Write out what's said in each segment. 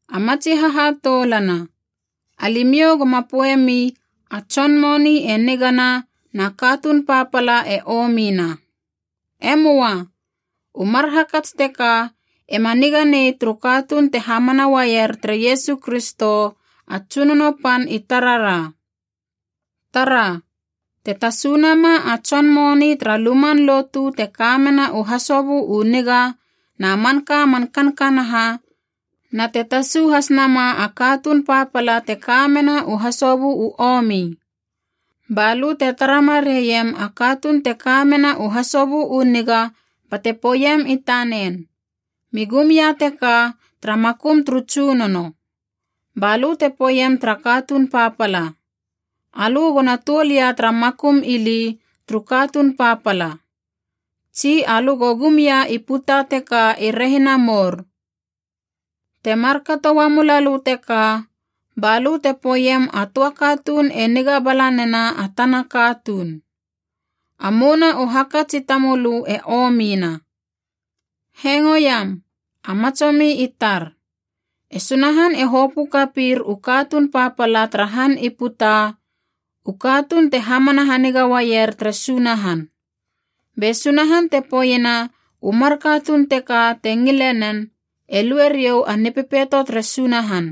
A matsi hahatoulana, alimiou goma poeiemi a tson moni e nigana na katuun papala e omina. E möa. U mar hakats teka ema niga nei turu katuun te hamana uaier tere Iesu Kristo a Tsunono Pan i tarara. Tara, te tasunama a tson moni tara luman lotu te kamena u hasobö u niga na manka man kankanaha, na te tasu has nama a katuun papala te ka mena u hasobö u omi. Balö te tara mareiem a katuun te ka mena u hasobö u niga bate poeiem i tanen, mi gum ia teka tara makum turu tsunono. Balö te poeiem tara katuun papala, alö go na tuol ia tara makum ili turu katuun papala, tsi alö go gum ia i puta teka i rehina mour. Te markato uamu lalö teka, ba lö te poeiem a töa katuun e niga bala nena a tana katuun. A mouna u hakats i tamölö e omina. Hengoiam, a matsomi i tar. E Sunahan e hopö kapir u katuun papala tara han i puta, u katuun te hamana haniga uaier tere Sunahan. Be Sunahan te poeiena u mar katuun teka te ngile nen, e lue riou a Nipepeito tere Sunahan.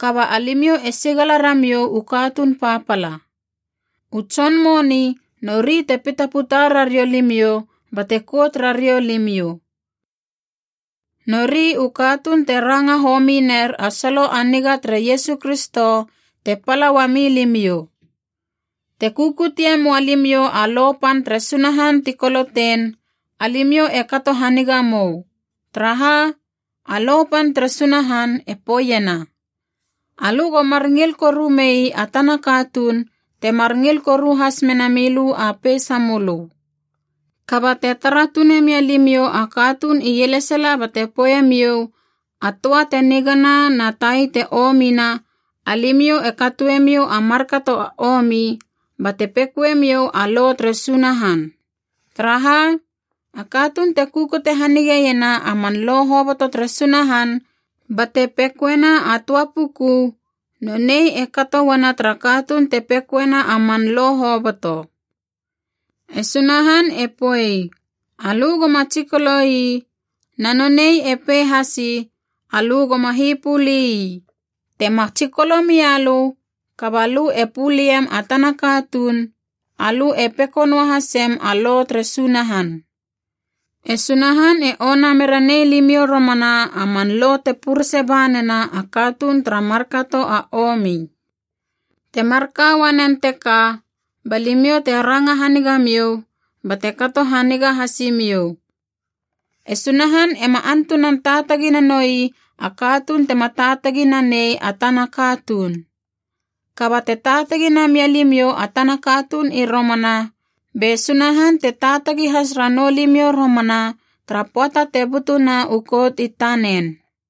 Kaba alimiou e sigala ramiou u katuun papala. U tson moni nori te pitaputa rariou limiou bate kout rariou limiou. Nori u katuun te ranga homi ner a solo a niga tere Iesu Kristo te pala uami limiou. Te kukutie moa limiou a lo pan tere Sunahan ti kolotein, alimiou e kato hanigamou. Taraha, a lo pan tere Sunahan e poeiena, alö go mar ngil koru mei a tana katuun temar ngil koru has mena milö a peisamölö. Kaba te tara tune mia limiou a katuun ielesala bate poeiemiou, a töa te nigana na tai e omina, alimiou e katoemiou a markato a omi, bate pekoemiou a lo tere Sunahan. Taraha, a katuun te kukute hanigeiena a man lo hoboto tere Sunahan bate pekoena a töa puku, nonei e kato uana tara katuun te pekoena a man lo hoboto. E Sunahan e poei, alö goma tsikolo ii, na nonei e pei hasi, alö goma hipöli ii. Te ma tsikolo mia lö kaba lö e puliem a tana katuun, alö e peko noahasem a lo tere Sunahan. E Sunahan e ona mera nei limiou romana a man lo te purese ba nena a katuun tara markato a omi. Te marka uanen teka ba limiou te ranga hanigamiou bate kato haniga hasimiou. E Sunahan ema antunan taatagi nanoi a katuun tema taatagi nanei a tana katuun. Kaba te taatagi namia limiou a tana katuun i romana, be Sunahan te taatagi has ranou limiou romana tara pöata te butuna u kout i tanen.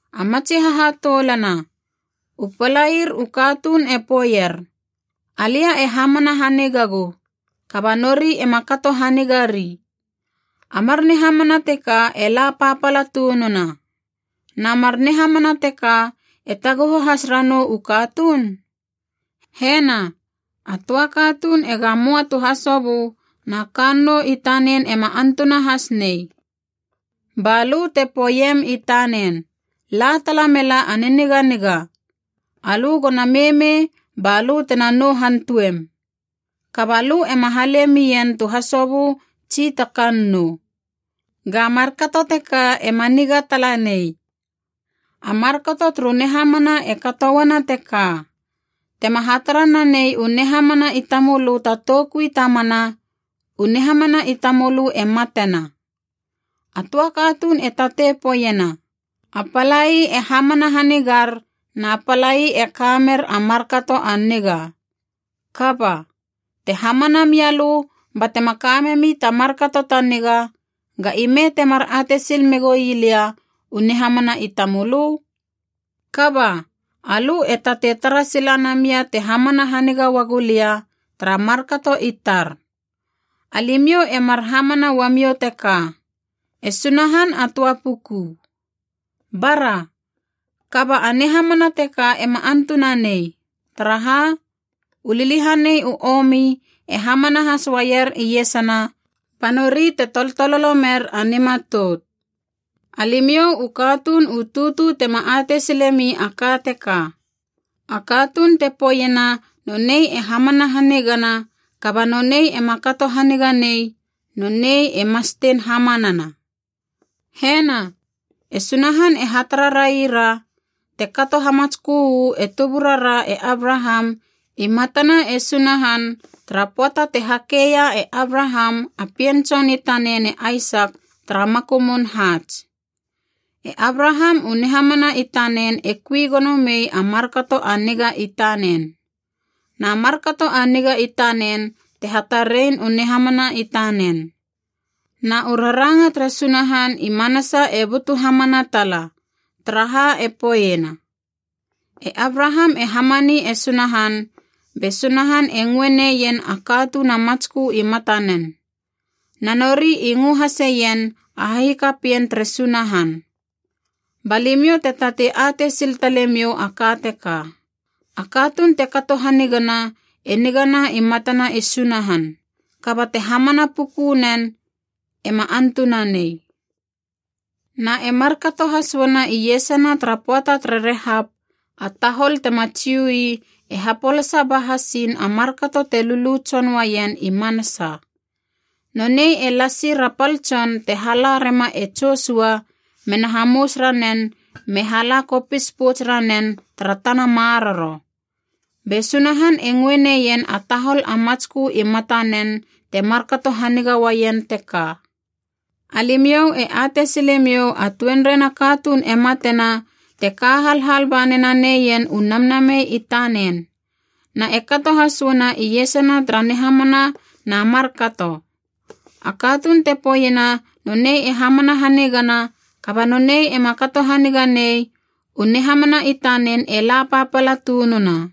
A matsi hahatoulana, u palair u katuun e poeier, “Alia e hamana hanigagu,” kaba nori ema kato hanigari. A mar nihamana teka e la papala tununa. Na mar nihamana teka e taguhu has ranou u katuun? Hena, a töa katuun ega möa tu hasobö na kannou i tanen ema antuna has nei. Ba lö te poeiem i tanen, “La tala mela a niniganiga. Alö go na meimei ba lö tena nou hantuem.” Kaba lö ema hale mien tu hasobö tsi ta tsi kannou. Ga markato teka ema niga tala nei. A markato turu nihamana e katouana teka: tema hatara nanei u nihamana i tamölö ta toukui ta mana, u nihamana i tamölö e matena. A töa katuun e tatei poeiena, “A palai e hamana hanigar na palai e kamer a markato a niga.” Kaba, te hamana mia lö batema kamemi ta markato ta niga, ga ime temar atei sil megoi lia u nihamana i tamölö? Kaba, alö e tatei tara sila namia te hamana haniga uagu lia, tara markato i tar. Alimiou e mar hamana uamiou teka: e Sunahan a töa puku. Bara! Kaba a nihamana teka ema antunanei. Taraha, u liliahaneia u omi e hamana has uaier iesana, ba nori te toltololo mer a nimatout. Alimiou u katuun u tutu tema atei silemi a ka teka: a katuun te poeiena nonei e hamana hanigana kaba nonei ema kato haniga nei, nonei e mastein hamanana. Hena, e Sunahan e hatara raira te kato hamatskö uu e tuburara e Abraham i matana e Sunahan tara pöata te hakeia e Abraham a pien tson i tanen e Aisak tara makumun haats. E Abraham u nihamana i tanen e kui gono mei a markato a niga i tanen. Na markato a niga i tanen te hatarein u nihamana i tanen. Na u raranga tere Sunahan i manasa e butu hamana tala, taraha e poeiena, “E Abraham e hamani e Sunahan, be Sunahan e ngöe neien a katuun a matskö i matanen.” Na nori i ngö haseien a hahikapien tere Sunahan. Ba limiou te tatei atei sil talemiou a ka teka: a katuun te kato hanigana e nigana i matana e Sunahan. Kaba te hamana puku nen, ema antunanei. Na e markato has uana iesana tara pöata tere Rehap a tahol tema Jiu ii e hapolasa ba hasiin a markato te lulu tson uaien i manasa. Nonei e lasir a pal tson te hala rema e Josua mena hamous ranen me hala kopis pouts ranen tara tana maroro. Be Sunahan e ngöe neien a tahol a matskö i matanen te markato haniga uaien teka. Alimiou e atei silemiou a tuenrei na katuun e matena te ka halhal ba mena neien u namnamei i tanen. Na e kato has uana iesana tara nihamana na markato. A katuun te poeiena nonei e hamana hanigana kaba nonei ema kato haniga nei, u nihamana i tanen e la papala tununa.